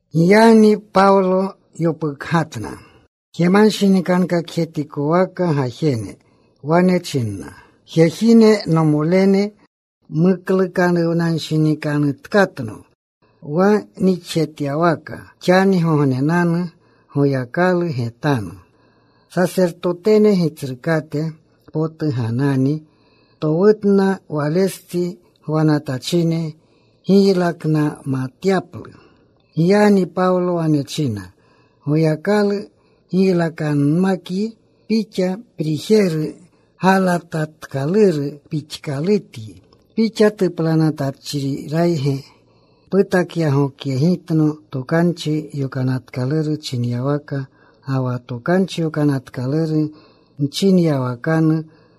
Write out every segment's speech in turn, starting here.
Giyagni Pawlo yopukgatna jemanshinikankakjetikowaka gajene. Wane china, “Jejine, nomolene, muklukanuwnanshinikanutkatno wa nixjetyawaka xanigognenanu Goyakalu getanu.” Sasertotene Gitsrukate potu Ganani towutna walestsi gwanatachine giylaknamatyaplu. Giyagni Pawlo wane china, “Goyakalu giylakanmakyi pixa, prijeru galatatkaluru pixkalutyi. ¿Pixa tuplanatachrirayge putakyagokyegitno Tokanchi Yokanatkaluru chinyawaka, ga wa Tokanchi Yokanatkaluru mchinyawakanu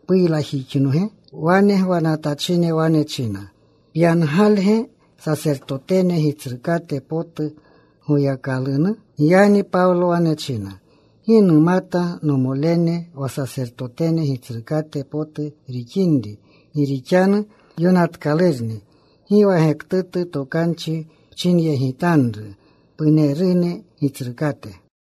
puylakjixnoge?” Wane gwanatachine wane china, “¿Pyangalge sasertotene gitsrukate potu Goyakalunu?” Giyagni Pawlo wane china, “Gi numata, nomolene, wa sasertotene gitsrukate potu rixinri. Gi rixanu yonatkalurni, Gi wa gektutu tokanchi pchinyegitanru punerune gitsrukate.”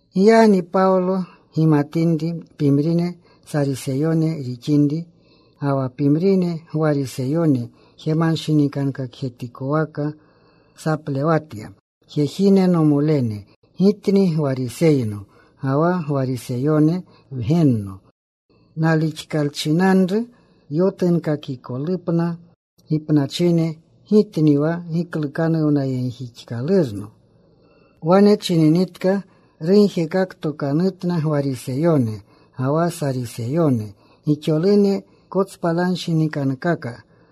Giyagni Pawlo gimatinri pimrine Sariseyone rixinri, ga wa pimrine Gwariseyone jemanshinikankakjetikowaka saplewatya, “Jejine, nomolene, gitni Gwariseyno, ga wa Gwariseyone wgenno. Nalixkalchinanru yotunkakikolupna gipnachine, gitni wa giklukanuwnayegjixkalurno.” Wane chininitka rugjekaktokanutna Gwariseyone ga wa Sariseyone. Gixolune kotspalanshinikankaka.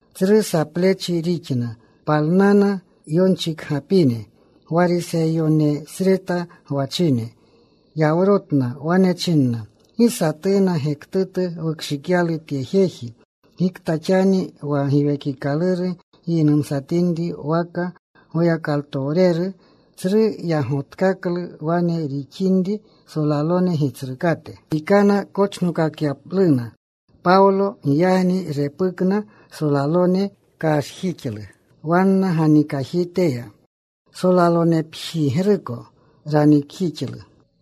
Tsru saplechi rixna. Palnana yonchikgapine Gwariseyonesreta gwachine. Yawrotna. Wane chinna, “Gi satuna gektutu wukshikyalu tye jeji. Gikta xani wa giwekikaluru giynumatinri waka Goyakalutowreru.” Tsru yagotkaklu wane rixinri, solalone gitsrukate pikana kochnokakyapluna Pawlo. Giyagni repukna solalone. Kashjixlu wanna ganikajiteya. Solalonepjigruko ranikjixlu.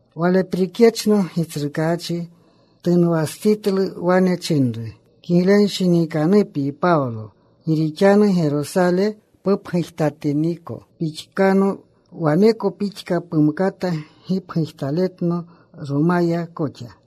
Waleprikyechno Gitsrukaachi tunwastsitlu. Wane chinru, “Kiglenshinikanupyi Pawlo. Gi rixanu Gerosale pupgujtatiniko pixkano waneko pixka pumkata gipgujtaletno Romaya koxa.”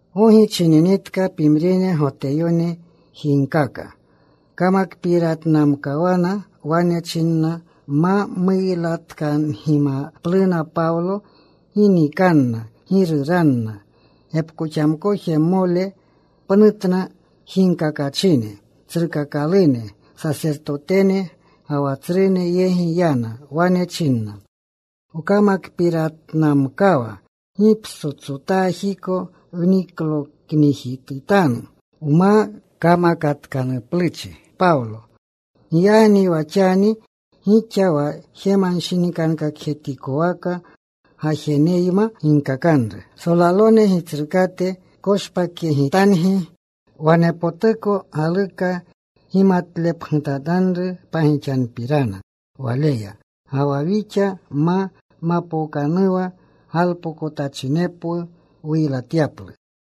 Gogi chininitka pimrine Goteyone jiigkaka. Kamakpiratnamkawana. Wane chinna ma muylatkangimapluna Pawlo gi nikanna, gi ruranna. Gepkoxamkojmole pnutna jiigkakachine. Tsrukakalune sasertotene ga wa tsrune yegi yana. Wane chinna, “Wkamakpiratnamkawa gi ptsotsotajiko wnikloknijitutanu wma kamakatkanupluchi Pawlo. Giyagni wa xani gixa wa jemanshinikankakjetikowaka gajeneyma ginkakanru solalone gitsrukate, koshpakyegitangi wanepotuko galuka gimatlepgutatanru pagixanupirana waleya. Ga wa wixa ma mapookanuwa galpokotachinepwu wuylatyaplu.”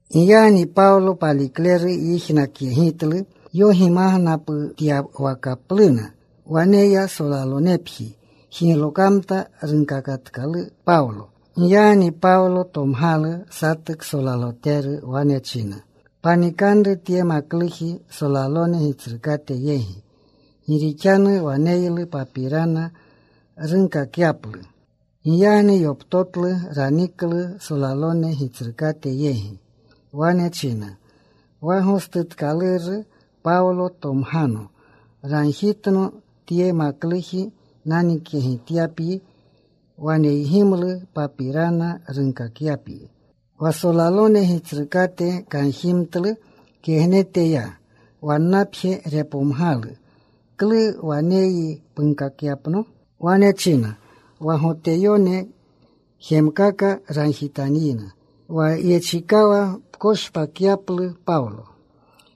Giyagni Pawlo palikleru yijnakyegitlu yogimagnaputyawakapluna. Wane ya. Solalonepji jiglokamta. Runkakatkalu Pawlo. Giyagni Pawlo tomgalu satu ksolaloteru. Wane china, “Panikanru tye makluji solalone gitsrukate yegi. Gi rixanu waneylu papirana runkakyaplu.” Giyagni yoptotlu. Raniklu solalone gitsrukate yegi. Wane china, “Wa gostutkaluru Pawlo tomgano. Ragjitno tye makluji nanikyegityapyi. Waneygimlu papirana runkakyapyi.” Wa solalone gitsrukate kanjimtlu. Kegnete ya wannapje. Repomgalu, “¿Klu waneyyi punkakyapno?” Wane china, “Wa Goteyone jemkaka ragjitanyina wa yechikawa pkoshpakyaplu Pawlo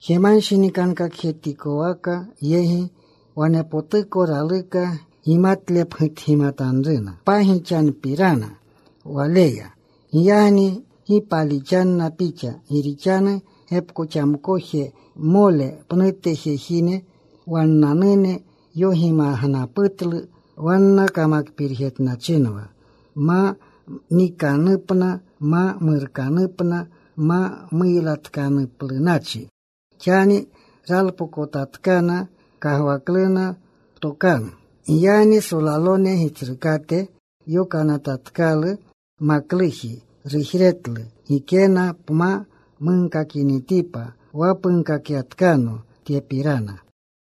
jemanshinikankakjetikowaka yegi. Wanepotuko raluka gimatlepgutgimatanruna pagixanupirana waleya. Giyagni gi palixanna pixa. Gi rixanu gepkoxamkojmole pnute jejine wannanune yogimagnaputlu. Wanna kamakpirjetnachinwa ma niikanupna, ma murkanupna ma muylatkanuplunachi. Xani ralpokotatkana. Kagwakluna ptokanu.” Giyagni solalone gitsrukate yokanatatkalu makluji. Rujretlu, “Gikena pma munkakinitipa wa punkakapyatkano tyepirana.”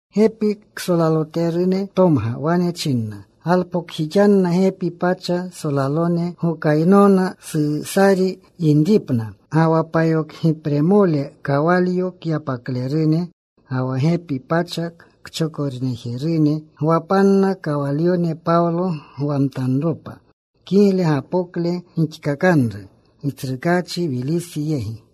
Gepi ksolaloterune tomga. Wane china, “Galpokjixanna gepi pacha solalone gokaynona Susari yinripna, ga wa payokgipremole kawalyo kyapaklerune, ga wa gepi pacha kchokorejerune. Gwapanna kawalyone Pawlo gwamtanropa. Kigle gapokle gixkakanru Gitsrukaachi Wilisi yegi.”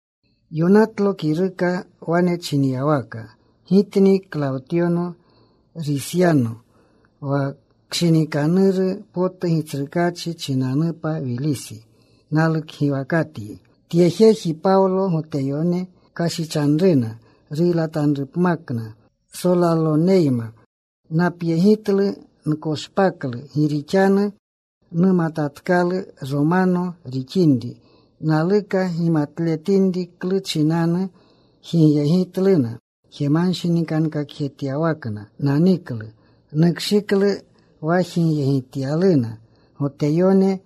Yonatlo kiruka wane chinyawaka: Gitni Klawtyo Risyano. Wa kshinikanuru potu Gitsrukaachi chinanupa Wilisi. Nalukgiwakatyi. Tye jeji, Pawlo, Goteyone kashichanruna, ruylatanrupmakna. Solaloneyma napyegitlu. Nkoshpaklu. Gi rixanu numatatkalu Romano rixinri. Naluka gimatletinri klu chinanu jigyegitluna. Jemanshinikankakjetyawakna naniklu. Nukshiklu wa jigyegityaluna Goteyone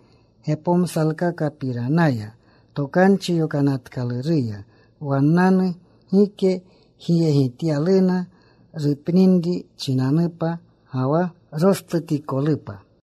gepomsalkakapiranaya Tokanchi Yokanatkaluruya wannanu. Gike jigyegityaluna rupninri chinanupa ga wa rostutikolupa.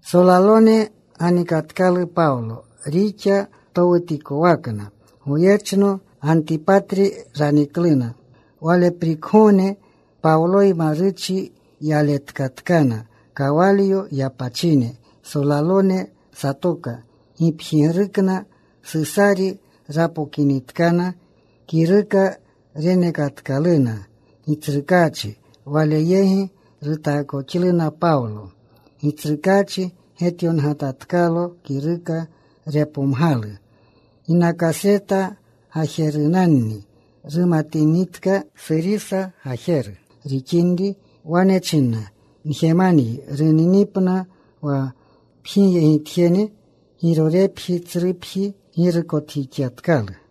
Solalone ganikatkalu Pawlo rixa towutikowakna. Goyechno Gantipatri ranikluna. Waleprikgogne Pawloyma ruchi yaletkatkana kawalyo yapachine. Solalone satoka gipjigrukna. Susari rapokinitkana. Kiruka renekatkaluna gitsrukaachi. Wale yegi rutaakoxluna Pawlo. Gitsrukaachi getyongatatkalo kiruka. Repomgalu ginakasreta gajerunanni. Rumatinitka Surisa gajeru rixinri, wane china, “Njemanyi runinipna wa pjigyegitjene.” Girorepji, tsrupji, girukotjixyatkalu.